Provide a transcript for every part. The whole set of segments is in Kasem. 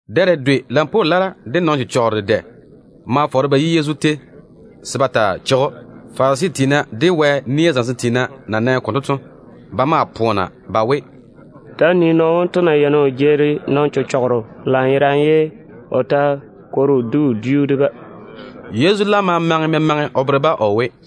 Dɛ dedwe lampwoo lara de nɔn-chechɔgero dedɛ ma fɔɔre ba yi Yezu tei se ba cheigi o kwora. Farisi tiina de Wɛ nia zamesem tiina na nɛ konto to, ba maa poona ba we, “Ta‑á nii nɔɔno wonto na yeini o jeeri nɔn-chechɔgero lanyerane, ye o ta kwori o di wodiu de-ba.” Yezu laam ma maŋe memaŋe o bere-ba o we: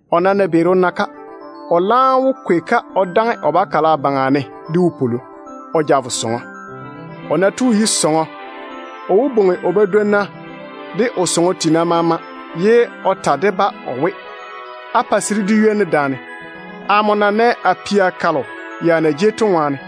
O nam ná beeri o na-ka, o laam wó kwei-ka o daŋe o bakala baŋa ne de wopwolo o ja vo sɔŋɔ. O ná tu o yi sɔŋɔ, o wó bwoŋi o badwonna de o sɔŋɔ tiina maama ye o ta de-ba o we, ‘Á pa se dé di ywoni daane, amo na nɛ a pia kalo ya na jei to ŋwaane.’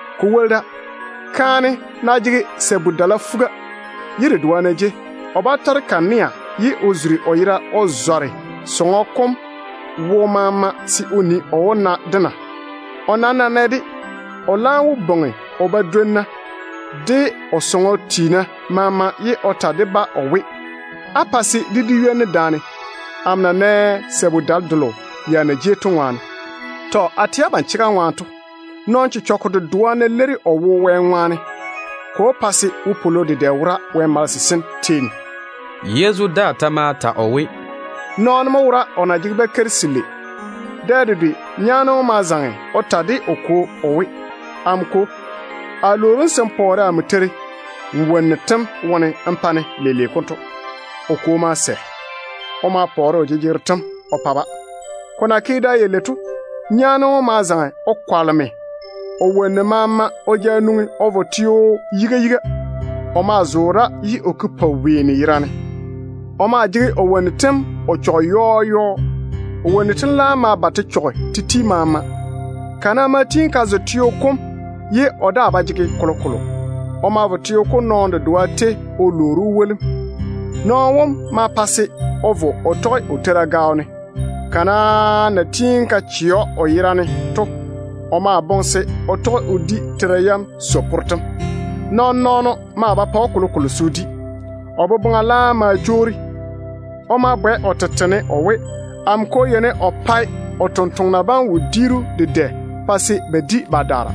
Ko woli da, kaane ná jege sabu-dala fuga, ye dedoa ná jei, o bá tɔre kanea ye o zuri o yera o zɔre sɔŋɔ kom wo maama se o nii, o wó na-de na? O nam ná nɛ-de, o laam wó bwoŋi o badwonna de o sɔŋɔ tiina maama, ye o ta de-ba o we, ‘Á pa se dé di ywoni daane, amo na nɛ sabu-dale delo ya na jei to ŋwaane.’ Tɔ. A tɛ abam chega ŋwaane to, nɔn-chechɔgɔ dedoa ná leiri o wo Wɛ ŋwaane, ko pa se wopwolo dedɛ wora Wɛ malese sem tei ne.” Yezu daa ta ma ta o we: “Nɔɔno mo wora o na jege bakeiri selei. Dɛ dedwe nyaane wom ma zaŋe o ta de o kwo o we, ‘Amo kwo, a lwoori‑m se n pɔɔre amo teiri nmo wonnu tem wone n pa-ne leile konto.’ O kwo ma sɛ. O ma pɔɔre o jejegero tem o pa o bia balei bam. Ko na ke da yalei to, nyaane wom ma zaŋe o kwaleme o wonnu maama o ja nwoŋi o vo sa-teo yiga yiga. O maa zoore da ye o ke poweeni yerane. O maa jege o wonnu tem o chɔge yɔɔ yɔɔ. O wonnu tem laam ma ba te chɔge te ti maama. Kana ma tiini ka zo teo kom ye o daa ba jege kolokolo. O ma vo teo kom nɔɔno dedoa tei o lwoori‑o wolim. Nɔɔno wom ma pa se o vo o tɔge o teira gaao ne. Kana na tiini ka chɛ o yera ne to, o ma boŋe se o tɔge o di teira yam so-porro tem. Nɔɔn-nɔɔno maa ba pa‑o kolokolo se o di. O boboŋa laam ma jwoori. O ma bwɛ o tete ne o we, ‘Amo kwo yeini o pae o tontoŋena bam maama wodiiru dedɛ pa se ba di ba daara.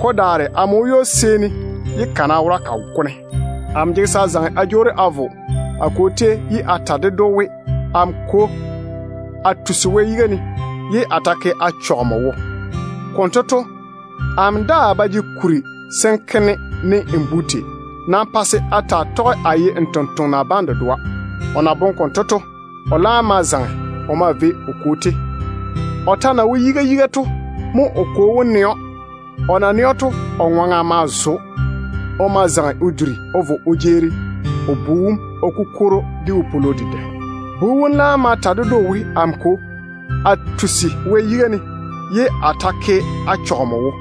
Ko daare amo wo ywo-seeni ye kana wora ka go-ne. Amo jege se a zaŋe a jwoori a vo a kwo tei ye a ta ded‑o we, “Amo kwo, a tusi a chɔge Wɛ yiga, ye a ta ke a chɔge nmo wo. Konto to, amo daa ba jege kuri se n ke-ne ne nmo bu tei. Nam pa se a taa tɔge a ye nmo tontoŋena bam dedoa.” ’ O na boŋe konto to, o laam ma zaŋe o maa vei o kwo tei. O ta na wo yiga yiga to mo o kwo wom nɛ‑o. O na nɛ‑o to, o bu wom ŋwaŋa ma zo‑o lanyerane. O ma zaŋe o duri o vo o jeeri o bu wom o kukwori‑o de wopwolo dedɛ. Bu wom laam ma ta ded‑o o we, ‘Amo kwo, a tusi a chɔge Wɛ yiga, ye a ta ke a chɔge nmo wo.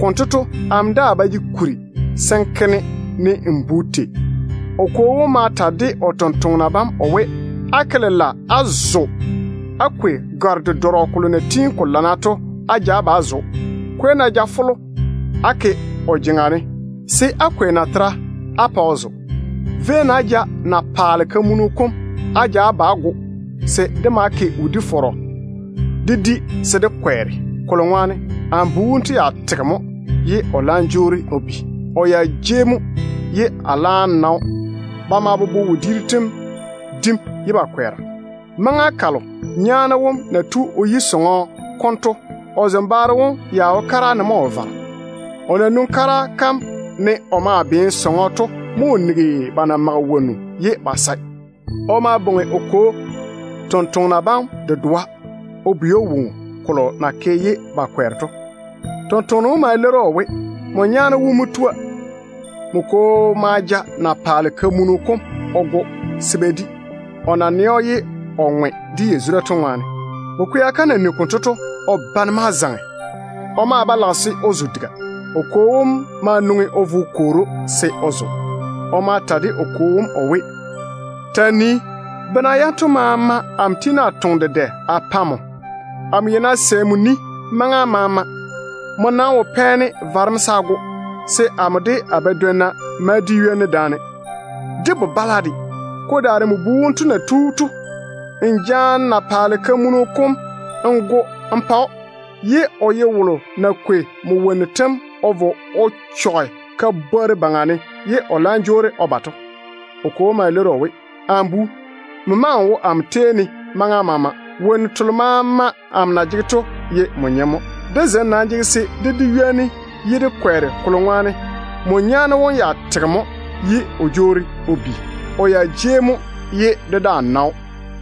Konto to, amo daa ba jege kuri se n ke-ne ne nmo bu tei.’ O kwo wom ma ta de o sɔŋɔ tontoŋena bam o we, ‘Á ke lela á zo á kwei gare-dedɔrɔ kolo na tiini ko lana to á ja ba á zo‑o. Kwei-na jafolo á ke o jeŋa ne, se á kwei natera de á pa o zo. Véi-na á ja na-paale kamunu kom á ja ba á go, se dé ma ke wodi-fɔrɔ dé di se dé daare dé kwɛɛre o ŋwaane. Kolo ŋwaane amo bu wonto ya tege mo ye o laam jwoori o bi. O ya jei mo ye a laam na‑o.’ Ba ma bobo wodiiru tem dim ye ba kwɛɛra. Maŋa kalo nyaane wom na tu o yi sɔŋɔ konto to, o zembaaro wom ya wo kara ne mo o vara. O na nwoŋi kara kam ne o maa beene sɔŋɔ to mo o nigi ba na mage wonnu ye ba sae. O ma bwoŋi o kwo tontoŋena bam dedoa o bwei‑o woŋo kolo na ke ye ba kwɛɛre to. Tontoŋeno wom ma leiri‑o o we, ‘Nmo nyaane wom mo tua. Nmo kwo ma ja na-paale kamunu kom o go se ba di, o na nɛ‑o ye o ŋwe de yazura to ŋwaane.’ Bu-kwea kam na nigi konto to, o bane ma zaŋe. O maa ba lage se o zo diga. O kwo wom ma nwoŋi o vo o kwoori‑o se o zo. O ma ta de o kwo wom o we, ‘Ta‑n nii, bena yanto maama amo tiini a toŋe dedɛ a pa nmo. Amo yeini a sɛ nmo ni maŋa maama. Nmo nam wo pɛ-ne varem se a go, se amo de a badwonna ma di ywoni daane, de bo-bala de. Ko daare nmo bu wonto na tu to, n jaane na-paale kamunu kom n go n pa‑o, ye o ye wolo na kwei nmo wonnu tem o vo o chɔge ka-bworru baŋa ne ye o laam jwoori o ba to.’ O kwo wom ma leiri‑o o we, ‘Amo bu, nmo maŋe n wo amo tei ne maŋa maama. Wonnu telo maama amo na jege to ye nmo nyem. Dé zem nam jege se dé di ywoni ye dé kwɛɛre, kolo ŋwaane nmo nyaane wom ya tege mo ye o jwoori o bi. O ya jei mo ye dé daa na‑o.’”